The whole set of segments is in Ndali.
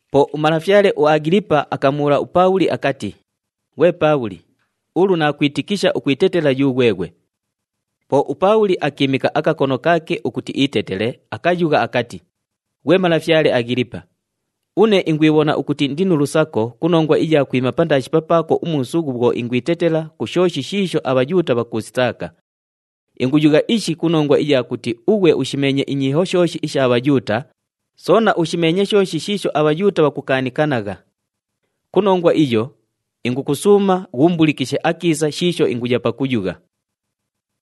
Po umalafyale uAghilipa akamubhuula uPaabhuli akati, “Ghwe Paabhuli, ulu naakwitikisha ukwitetela yughweghwe.” Po uPaabhuli akiimika akakono kaake ukuti iitetele, akayugha akati, “Ghwe malafyale Aghilipa, une ingwibhona ukuti indi nu lusako ku nongwa iya kwima pandaashi papaako umuusughu bhwo ingwitetela ku shooshi shiisho aBhayuuta bhakuusitaaka. Inguyugha ishi ku nongwa iya kuti ughwe ushimeenye inyiiho shooshi isha Bhayuuta, soona ushimeenye shooshi shiisho aBhayuuta bhakukaanikanagha. Ku nongwa iyo, ingukusuuma ghuumbulikishe akiisa shiisho inguya pakuyugha.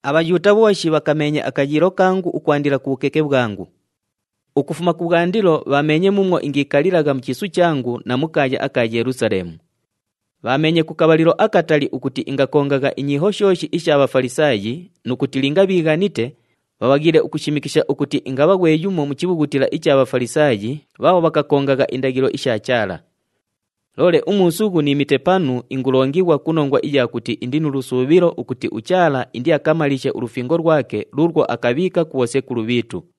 “ABhayuuta bhooshi bhakameenye akayiilo kangu ukwandila ku bhukeke bhwangu. Ukufuma kubhwandilo bhaameenye muumwo ingiikalilagha mu chiisu changu na mu kaaya aka Yelusaleemu. Bhaameenye ku kabhalilo akatali ukuti ingakongagha inyiiho shooshi isha Bhafalisaayi nu kuti linga bhiighanite, bhabhaghiile ukushimikisha ukuti ingabha ghwe yumo mu chibhughutila icha Bhafalisaayi bhaabho bhakakongagha indaghilo isha Chaala. Loole umuusughu niimite panu ingulongighwa ku nongwa iya kuti indi nu lusuubhilo ukuti uChaala indiakamaliishe ulufingo lwake luulwo akabhiika ku bhosekulu bhiitu.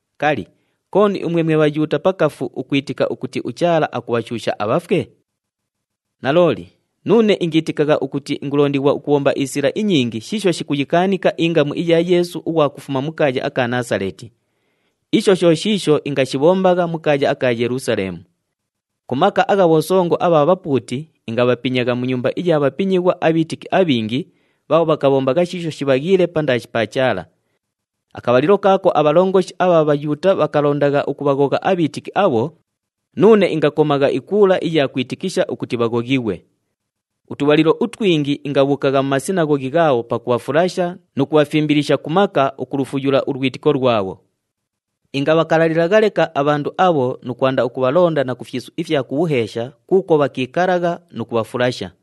Kali, kooni umwe mwe Bhayuuta pakafu ukwitika ukuti uChaala akubhashuusha abhafwe? “Nalooli, nuune ingiitikagha ukuti ingulondighwa ukubhomba isila inyingi shiisho shikuyikaanika ingamu iya Yeesu ughwa kufuma mu kaaya aka Naasaleeti. Isho sho shiisho ingashibhombagha mu kaaya aka Yelusaleemu. Ku maka agha bhosongo abha bhapuuti ingabhapinyagha mu nyumba iya bhapinyighwa abhiitiki abhingi bhaabho bhakabhombagha shiisho shibhaghiile pandaashi pa Chaala. Akabhalilo kaako abhalongoshi abha Bhayuuta bhakalondagha ukubhaghogha abhiitiki abho, nuune ingakomagha ikuula iya kwitikisha ukuti bhaghoghighwe. Utubhalilo utwingi ingabhuukagha mu masinaghoghi ghaabho pakubhafulasha nu kubhafimbilisha ku maka ukulufuyula ulwitiko lwabho. Ingabhakalalilagha leka abhandu abho nu kwanda ukubhalonda na ku fyisu ifya ku bhuheesha kuukwo bhakiikalagha nu kubhafulasha.”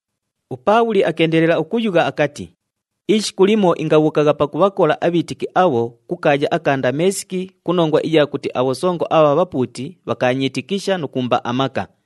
UPaabhuli akeendelela ukuyugha akati, “Ishiku limo ingabhuukagha pakubhakola abhiitiki abho ku kaaya aka Ndameesiki ku nongwa iya kuti abhosongo abha bhapuuti bhakaanyiitikisha nu kuumba amaka.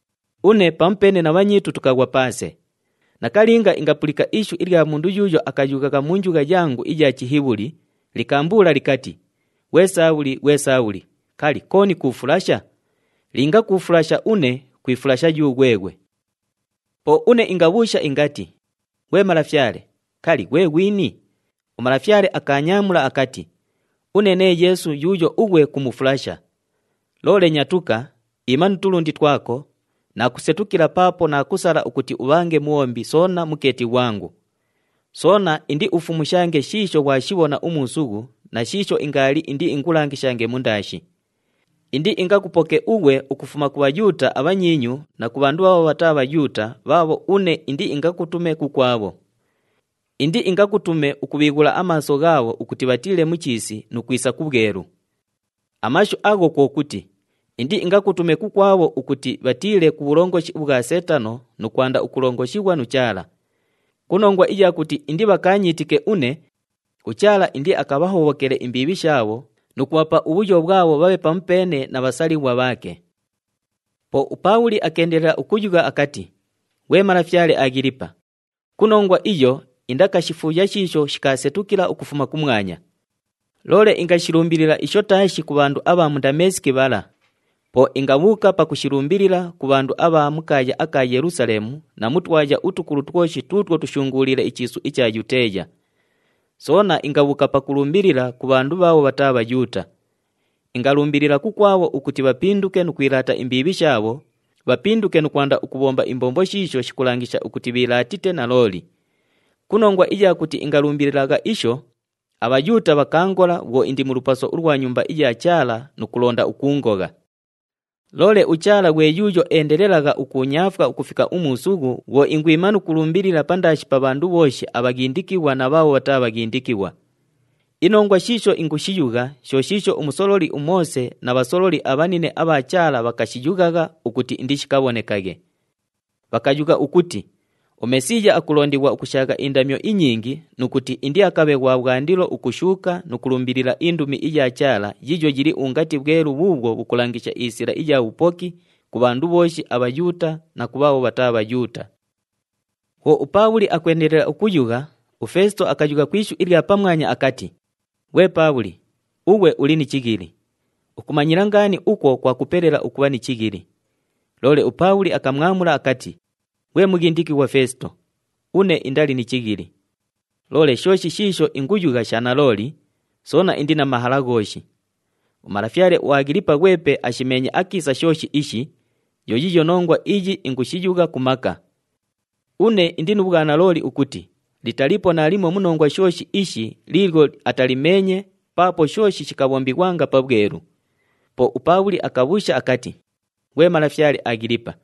Une pamupeene na bhanyiitu tukaghwa paase. Nakalinga ingapulika ishu ilya mundu yuuyo akayughagha mu njugha yangu iya Chihibhuli, likaambuula likati, ‘Ghwe Saabhuli! Ghwe Saabhuli! Kali, kooni kuufulasha? Linga kuufulasha une, kwifulasha yughweghwe.’ “Po une ingabhuusha ingati, ‘Ghwe Malafyale, kali, ghwe ghwini?’ UMalafyale akaanyaamula akati, ‘Une nee Yeesu yuuyo ughwe kumufulasha. Loole nyatuka, iima nu tulundi twako, naakusetukila paapo naakusala ukuti ubhange mubhombi soona mukeeti ghwangu. Soona indiufumushange shiisho ghwashibhona umuusughu na shiisho ingaali indiingulangishange mundaashi. Indiingakupoke ughwe ukufuma ku Bhayuuta abhanyiinyu na ku bhandu bhaabho bhataa Bhayuuta bhaabho une indiingakutume kukwabho. Indiingakutume ukubhiighula amaaso ghaabho ukuti bhatiile mu chiisi nu kwisa ku bhwelu. Amashu agha kwo kuti, indiingakutume kukwabho ukuti bhatiile ku bhulongoshi ubhwa Seetano nu kwanda ukulongoshighwa nu Chaala. Ku nongwa iya kuti indibhakaanyiitike une, uChaala indiakabhahobhokele imbiibhi shaabho nu kubhapa ubhuyo bhwabho bhabhe pamupeene na bhasalighwa bhaake.’” Po uPaabhuli akeendelela ukuyugha akati, “Ghwe malafyale Aghilipa, ku nongwa iyo indakashifuuya shiisho shikaasetukila ukufuma kumwanya. Loole ingashilumbilila isho taashi ku bhandu abha mu Ndameesiki bhala. Po ingabhuuka pakushilumbilila ku bhandu abha mu kaaya aka Yelusaleemu na mu twaya utukulu twoshi tuutwo tushunguuliile ichiisu icha Yuteeya. Soona ingabhuuka pakulumbilila ku bhandu bhaabho bhataa Bhayuuta. Ingalumbilila kukwabho ukuti bhapinduke nu kwilaata imbiibhi shaabho, bhapinduke nu kwanda ukubhomba imbombo shiisho shikulangisha ukuti bhiilaatite nalooli. Ku nongwa iya kuti ingalumbililagha isho, aBhayuuta bhakaangola bhwo indi mu lupaso ulwa Nyumba iya Chaala nu kulonda ukuungogha. Loole uChaala ghwe yuuyo endelelagha ukuunyaafwa ukufika umuusughu, bhwo ingwima nu kulumbilila pandaashi pa bhandu bhooshi abhaghindikighwa na bhaabho bhataa bhaghindikighwa. Inongwa shiisho ingushiyugha sho shiisho umusololi uMoose na bhasololi abhanine abha Chaala bhakashiyughagha ukuti indishikabhonekaghe. Bhakayugha ukuti uMesiiya akulondighwa ukushaagha indamyo inyingi, nu kuti indiakabhe ghwa bhwandilo ukushuuka nu kulumbilila indumi iya Chaala, yiiyo yili ungati bhwelu bhuubhwo bhukulangisha isila iya bhupoki ku bhandu bhooshi aBhayuuta na ku bhaabho bhataa Bhayuuta.” Bhwo uPaabhuli akwendelela ukuyugha, uFeesito akayugha ku ishu ilya pamwanya akati, “Ghwe Paabhuli, ughwe uli ni chighili! Ukumanyila ngaani ukwo kwakupelela ukubha ni chighili!” Loole uPaabhuli akamwamula akati, “Ghwe mughindikighwa Feesito, une indali ni chighili. Loole shooshi shiisho inguyugha sha nalooli, soona indi na mahala ghooshi. Umalafyale uAghilipa ghwepe ashimeenye akiisa shooshi ishi, yo yiiyo nongwa iyi ingushiyugha ku maka. Une indi nu bhwanalooli ukuti litaliipo naalimo mu nongwa shooshi ishi liilyo atalimeenye paapo shooshi shikabhombighwanga pabhwelu.” Po uPaabhuli akabhuusha akati, “Ghwe malafyale Aghilipa,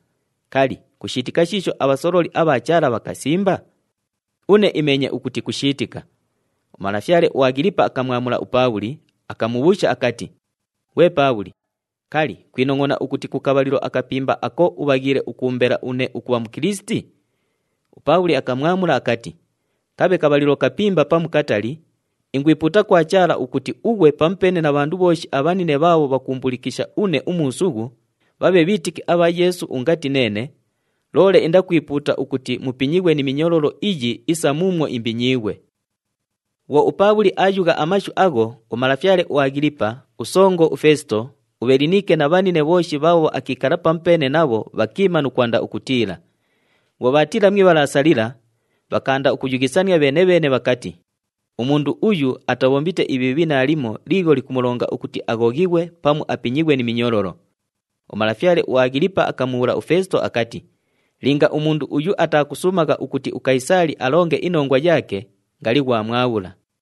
kali, kushiitika shiisho abhasololi abha Chaala bhakasimba? Une imeenye ukuti kushiitika.” Umalafyale uAghilipa akamwamula uPaabhuli, akamubhuusha akati, “Ghwe Paabhuli, kali, kwinongʼona ukuti ku kabhalilo akapimba ako ubhaghiile ukuumbela une ukubha Mukilisiti?” UPaabhuli akamwamula akati, “Kabhe kabhalilo kapimba pamu katali, ingwipuuta kwa Chaala ukuti ughwe pamupeene na bhandu bhooshi abhanine bhaabho bhakuumbulikisha une umuusughu bhabhe bhiitiki abha Yeesu ungati neene, loole indakwipuuta ukuti mupinyighwe ni minyololo iyi isa muumwo imbinyiighwe.” Bhwo uPaabhuli aayugha amashu agho, umalafyale uAghilipa, usongo uFeesito, uBhelinike na bhanine bhooshi bhaabho akiikala pamupeene nabho bhakiima nu kwanda ukutiila. Bhwo bhaatiila mu ibhalaasa lila, bhakaanda ukuyughisania bheene-bheene bhakati, “Umundu uyu atabhombite ibhiibhi naalimo liilyo likumulonga ukuti aghoghighwe pamu apinyighwe ni minyololo.” Umalafyale uAghilipa akamubhuula uFeesito akati, “Linga umundu uyu atakasuumagha ukuti uKayisaali alonge inongwa yaake, ngali ghwamwabhula.”